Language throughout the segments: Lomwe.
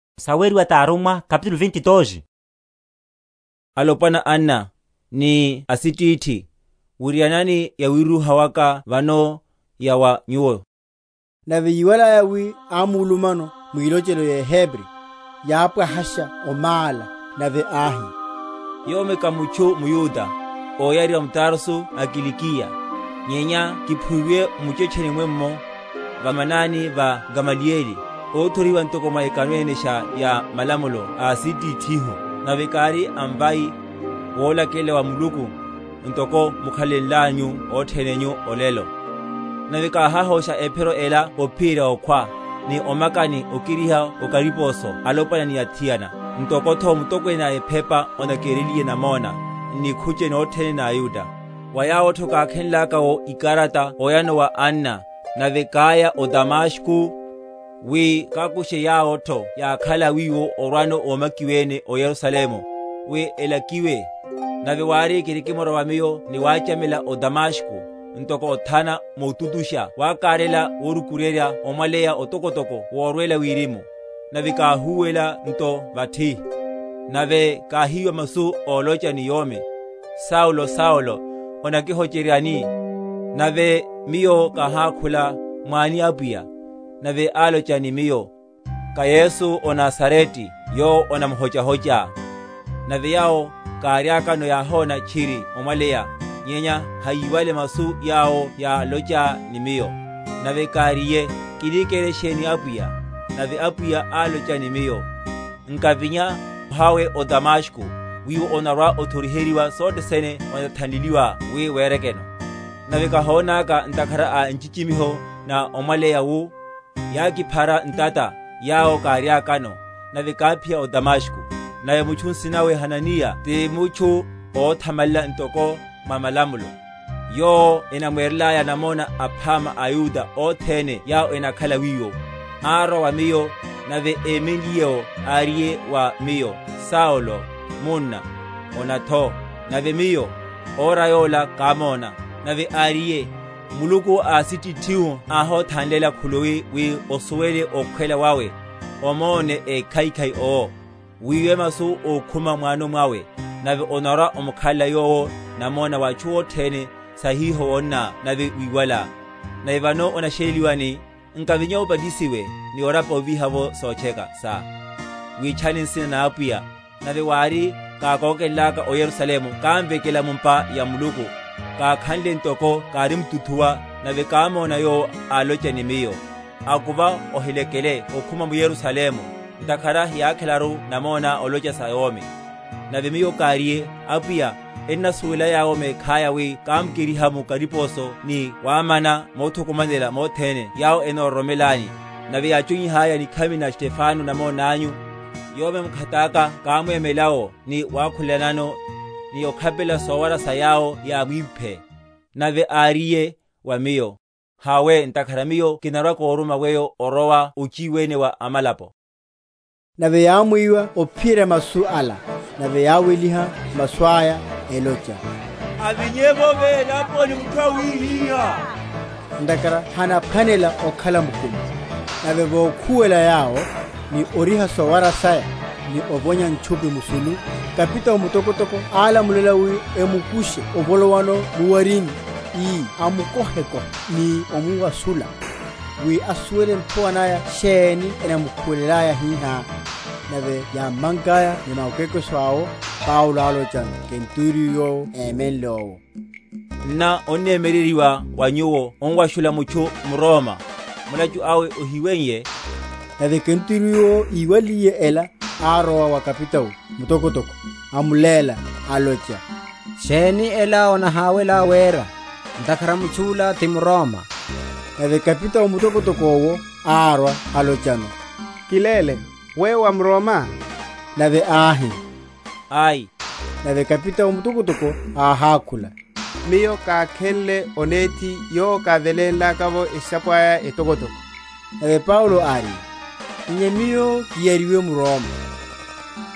Wirúha wawe wa Paulo wa atchu. Alopwana, anna, ni asitithi, wirianani yawiruha waka vano, ya wa nyuwo. Nave yíwalaya wi ámulumano mwilochelo yeHebri, yápwahasha omála; nave áhi: Yomi ká mutchu mYuda, óyariwa m’Tarso a Kilikiya, nyenya kiphuiwe m’muchetcheni mwenno, va manani va Gamaliyeli, óthoriheryiwa ntoko mwa ekano enesha ya malamulo a asitithihu, nave kári a mvai, wolakelela wa Muluku, ntoko mukhalelanyu othene nyu olelo; nave káhahosha Ephiro ela ophiyerya okhwa, ni omaka ni okeriha o kariposo alopwana ni athiana. Ntoko’tho mutokwene a ephepa onakereliye namona, n’nikhuche nothene na aYuda; wa yawo’tho kákhe?-?nlaka’wo ikarata oyano wa anna, nave káya o Damasko, wi kakushe yawo’tho yákhala wiwo orwano ómakiwene o Yerusalemu, wi elakiwe. Nave wári, kirikimrowa miyo ni wachamela o Damasko, ntoko othana, motutusha wakaryela vokirukuryerya omwaleya otokotoko worwela wirimu. Nave káhúwela nto vathi, nave káhiwa masu olocha ni yomi, Saulo, Saulo, onakihocheryani? Nave miyo, káhákhula, Mwáni Apwiya? Nave alocha in miyo, Ká Yesu ó Nazarete yowo onamuhochá. Nave yawo káriakano yáhona tchiri omwaleya, nyenya hayíwale masu yawo yálocha ni miyo. Nave káriye, Kini kere sheni, Apwiya? Nave Apwiya álocha ni miyo, Nkavinya, hawe o Damasko; wiwo onarwa‐othoriheryiwa sothe sene othanleliwelá wi werekeno. Nave kahónaka ntakhara a nchichimiho na omwaleya wu, yákiphara ntata yawo káriakano, nave káphiya o Damasko. Nave mutchu nsina nawe Hananiya ti mutchu óthamalela ntoko mwa malamulo, yowo enamwerelaya namona aphama aYuda othene yawo enakhala wiwo, árwa wa miyo, nave émenliye’wo áriye wa miyo, Saulo, munna, ona’tho. Nave miyo, ora yola kámóna. Nave áriye, Muluku a asitithihu ahothanlela khuluwi wi osuwele okhwela wawe, omone Ékhaikhai owo, wiwe masu ókhuma m’wano mwawe. Nave onarwa‐omukhalela Yowo namona wa atchu othene, sa hiho wonná nave wiwalá. Nave vano onasheleliwelani? Nkavinya, obatisiwe ni orapa ovíha’vo sotcheka sá, witchane nsina na Apwiya. Nave wári, kákókenlaka o Yerusalemu kámvekela mu’mpa ya Muluku, kákhanle ntoko kárimtuthuwa, nave kámona Yowo, alocha ni miyo, Akuva, ohilekele okhuma m’Yerusalemu; ntakhara hiyákhelaru namoná olocha sa Yomi. Nave miyo káriye, Apwiya, ennasuwela yawo mekhaya wi kámakeriha mu kariposo ni wamana mothukumanela mothene yawo enororomelani; nave yáchonyihalaya nikhami na Stefano namona anyu, yomi mkhataka kámwemela’wo, ni wakhulela?-?nano, ni okhapelela sowara sa yawo yámwimphe. Nave áriye wa miyo, Hawe; ntakhara Miyo kinarwa‐koruma weyo orowa ochiwene wa amalapo. Nave yámwiwa ophiyerya masu ala; nave yáweliha masu aya elocha, Avinye’vo velaponi mutchu awihihá; ntakhara hanaphwanela okhala mukumi. Nave vokhuwela yawo, ni oriha sowara saya, ni ovonya ntchupi musulu, kapitao mutokotoko álamulela wi emukushe ovolowano mu’warini, ii amukohekohe ni omuwashula, wi asuwele nthowa naya sheni enamukhuwelelaya hihá. Nave yámmankaya ni makwekweso awo, Paulo álochano kenturiyo yowo émenle’wo, Nná onnemyereryiwa wa nyuwo omuwashula mutchu mRoma, mulachu awe ohiweiye? Nave kenturiyo’wo íwaliye ela, árowa wa kapitao mutokotoko, amuléla, alocha, Sheni ela onahawelá wera? ntakhara mutchu’la ti mRoma. Nave kapitao mutokotoko’wo arwa, álochano, Kiléle, weyo wá mRoma? Nave áhi, Ai. Nave kapitao mutokotoko áhákhula, Miyo kákhenle onethi yowo kávelenlaka’vo esisapo aya etokotoko. Nave Paulo áriye, Nyenya miyo kiyariwe mRoma.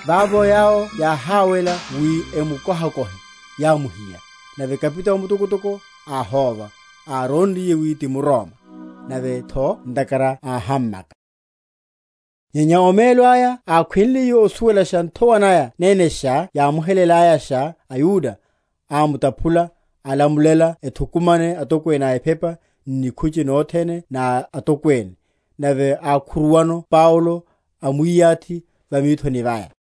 Vavo yawo yáháwela wi emukohekohe, yámuhiya; nave kapitao mutokotoko áhóva, árónriye wi ti mRoma, nave’tho ntakhara áhammaka. Paulo va nikhucheni na atokwene. Nyenya omelo aya ákhwenliye osuwelasha nthowa naya nenesha yámuhelelayanosha aYuda, ámutaphula, alamulela ethukumane atokwene a ephepa, n’nikhuche nothene na atokwene, nave ákhuruwano Paulo, amwiyathi va mithoni vaya.